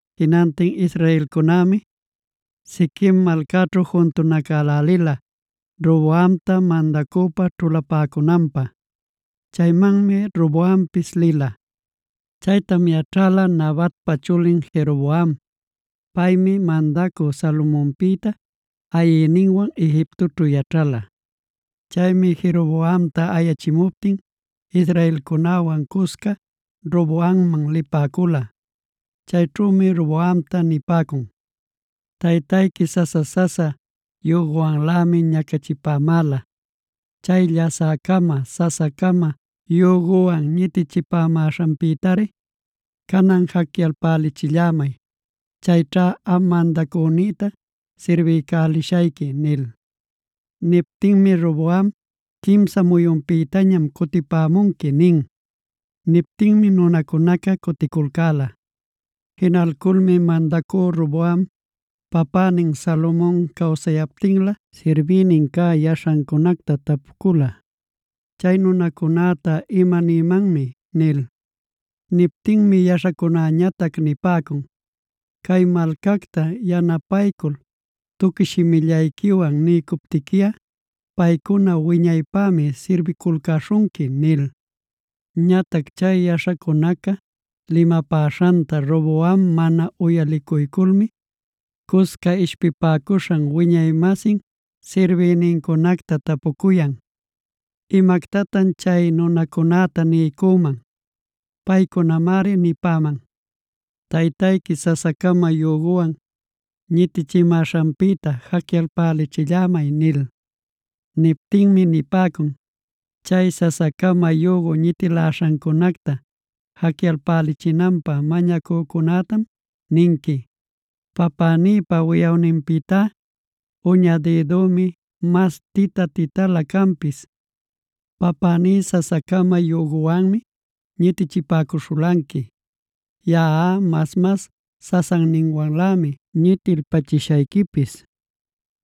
Jinantin israelcunämi Shiquem malcaćhu juntunacälälila Roboamta mandacüpa ćhulapäcunanpä. Chaymanmi Roboampis lila. Chaytam yaćhäla Nabatpa chulin Jeroboam. Paymi mandacü Salomonpïta ayïninwan Egiptoćhu yaćhala. Chaymi Jeroboamta ayachimuptin israelcunäwan cusca Roboamman lipäcula. Chayćhümi Roboamta nipäcun: “Taytayqui sasa-sasa yüguwanlämi ñacachipämäla. Chay llasä-cama, sasa-cama yüguwan ñitichimäśhanpïtari canan jacyalpälichillämay. Chayćha am mandacünïta sirbiycälishayqui” nil. Niptinmi Roboam: “Quimsa muyunpïtañam cutipämunqui” nin. Niptinmi nunacunaca cuticulcäla. Jinalculmi mandacü Roboam papänin Salomon cawsayaptinlä sirbïnin cä yaśhancunacta tapucula: “¿Chay nunacunäta imanïmanmi?” nil. Niptinmi yaśhacunäñatac nipäcun: “Cay malcacta yanapaycul tuqui shimillayquiwan niycuptiquiꞌa, paycuna wiñaypämi sirbiculcäśhunqui” nil. Ñatac chay yaśhacunaca limapäśhanta Roboam mana uyalicuyculmi, cusca ishpipäcuśhan wiñay-masin sirbïnincunacta tapucuyan: “¿Imactatan chay nunacunäta nïman? Paycunamari nipäman: ‘Taytayqui sasa-cama yüguwan ñitichimäśhanpïta jacyalpälichillämay’” nil. Niptinmi nipäcun: “Chay sasa-cama yügu ñitiläśhancunacta jacyalpachinanpä mañacücunätam ninqui: ‘Papänïpa wiꞌawninpïtá, uña dïdümi mas tita-titalä canpis. Papäní sasa-cama yüguwanmi ñitichipäcuśhulanqui; yaꞌa mas-mas sasanninwanlämi ñitilpachishayquipis.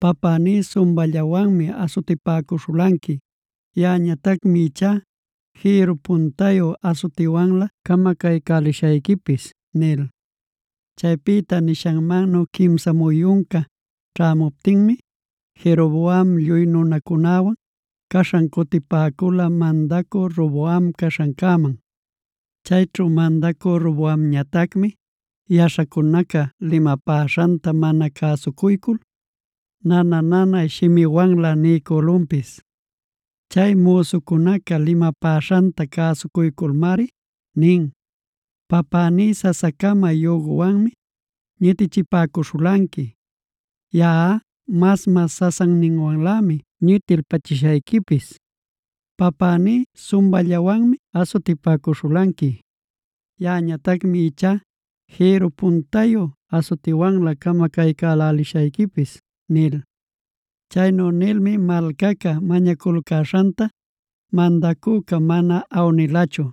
Papäní sumballawanmi asutipäcuśhulanqui; yaꞌañatacmi ichá jïrru puntayu asutiwanlä camacaycälishayquipis’” nil. Chaypïta nishanmannu quimsa muyunca ćhämuptinmi, Jeroboam lluy nunacunäwan caśhan cutipäcula mandacü Roboam caśhancäman. Chayćhu mandacü Roboamñatacmi yaśhacunaca limapäśhanta mana cäsucuycul nana-nanay shimiwanlä niycülunpis. Chay müsucunaca limapäśhanta cäsucuyculmari nin: “Papäní sasa-cama yüguwanmi ñitichipäcuśhulanqui; yaꞌa mas-mas sasanninwanlämi ñitilpachishayquipis. Papäní sumballawanmi asutipäcuśhulanqui; yaꞌañatacmi ichá jïrru puntayu asutiwanlä camacaycälälishayquipis” nil. Chaynu nilmi malcaca mañaculcäśhanta mandacüca mana awnilachu.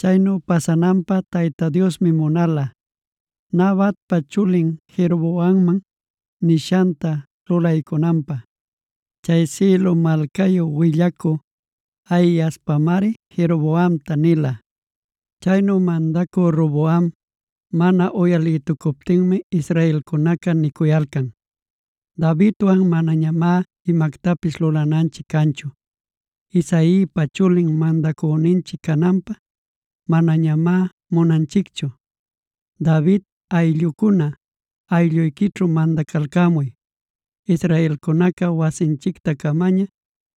Chaynu pasananpä Tayta Diosmi munala, Nabatpa chulin Jeroboamman nishanta lulaycunanpä. Chay Silo malcayu willacü Ahiaspamari Jeroboamta nila. Chaynu mandacü Roboam mana uyalïtucuptinmi israelcunaca nicuyalcan: “Davidwan manañamá imactapis lulananchic canchu. Isaipa chulin mandacüninchic cananta manañamá munanchicchu. ¡David ayllucuna, aylluyquićhu mandacalcämuy! ¡Israelcunaca, wasinchicta-camaña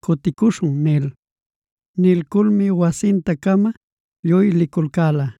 cuticuśhun!” nil.a Nilculmi wasinta-cama lluy liculcäla.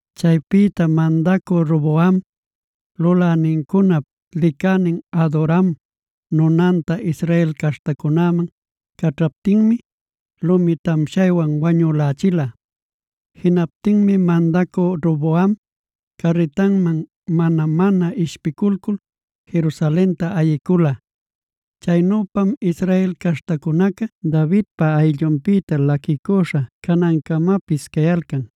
Chaypïta mandacü Roboam lulänincunap licänin Adoram nunanta Israel caśhtacunäman caćhaptinmi, lumi tamshaywan wañülächila. Jinaptinmi mandacü Roboam carritanman mana-mana ishpiculcul Jerusalenta ayicula. Chaynüpam Israel caśhtacunaca Davidpa ayllunpïta laquicüśha canancamapis cayalcan.